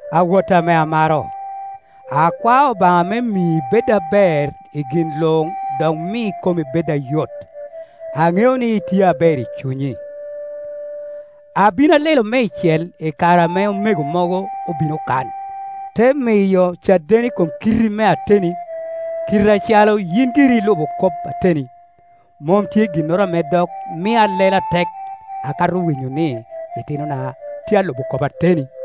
Awotta ame amaro, akwao Obaŋa me mi ibed aber i gin luŋ dok mi komi bed ayot. Aŋeo ni itye aber i cunyi. Abin alelo meicel i kare ame omego mogo obino kan, te miyo caden i kom kitti me ateni, kite acalo yin giri ilubo kop ateni. Mom tye ginnoro ame dok mia alelo atek akato winyo ni itinona tye alubo kop ateni.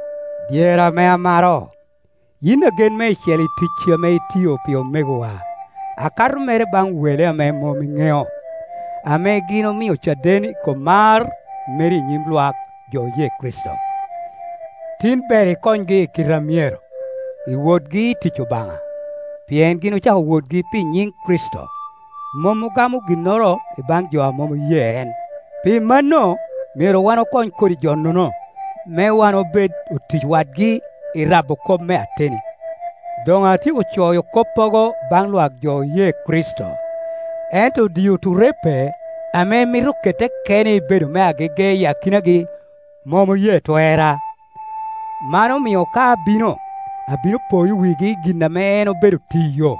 Dyerra ame amaro, yin agen meicel i ticci ame itiyo pi omegowa, akato mere baŋ wele ame mom iŋeo, ame gin omio caden i kom mar meri i nyim lwak jo oye Kricito. Tim ber ikonygi i kite a myero, i wotgi i tic Obaŋa. Pien gin ocako wotgi pi nyiŋ Kricito, mom ogamo ginnoro i baŋ jo a mom oye en. Pi mano, myero wan okony kodi Jo-nono, me wan obed otic wadgi i rabo kop me ateni. Doŋ atyeko coyo koppogo baŋ lwak jo oye Kricito, ento Dioturepe ame mito kette kene ibedo me agege i akinagi, mom oye twerra. Man omio ka abino, abino poyo wigi i gin ame en obedo tiyo,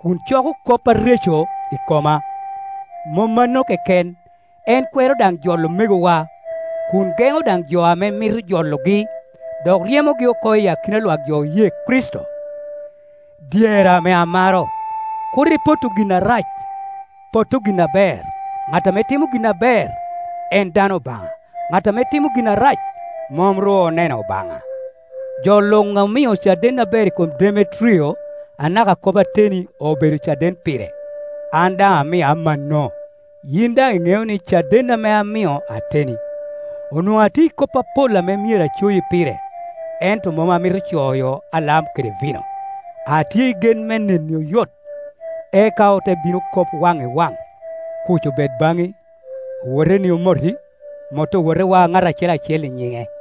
kun coko kop areco i koma, Mom mano keken, en kwero daŋ jolo omegowa, kun geŋo daŋ jo ame mito jologi, dok ryemogi oko i akina lwak jo oye Kricito. Dyerra ame amaro, kur ipotto gin arac, potto gin aber, ŋat ame timo gin aber, en dano Obaŋa; ŋat ame timo gin arac, mom ru oneno Obaŋa. Jo luŋ omio caden aber i kom Demetrio, anaka kop ateni obedo caden pire; an daŋ amio amanno, yin daŋ iŋeo ni caden ame amio ateni. Onwoŋo atye i kop apol ame myero acoyi pire, ento mom amito coyo alam kede vino. Atye i gen me neni oyot, eka ote bino kop waŋ i waŋ. Kuc obed baŋi, Owoteni omoti, Mot owotewa, ŋat acel acel i nyiŋe.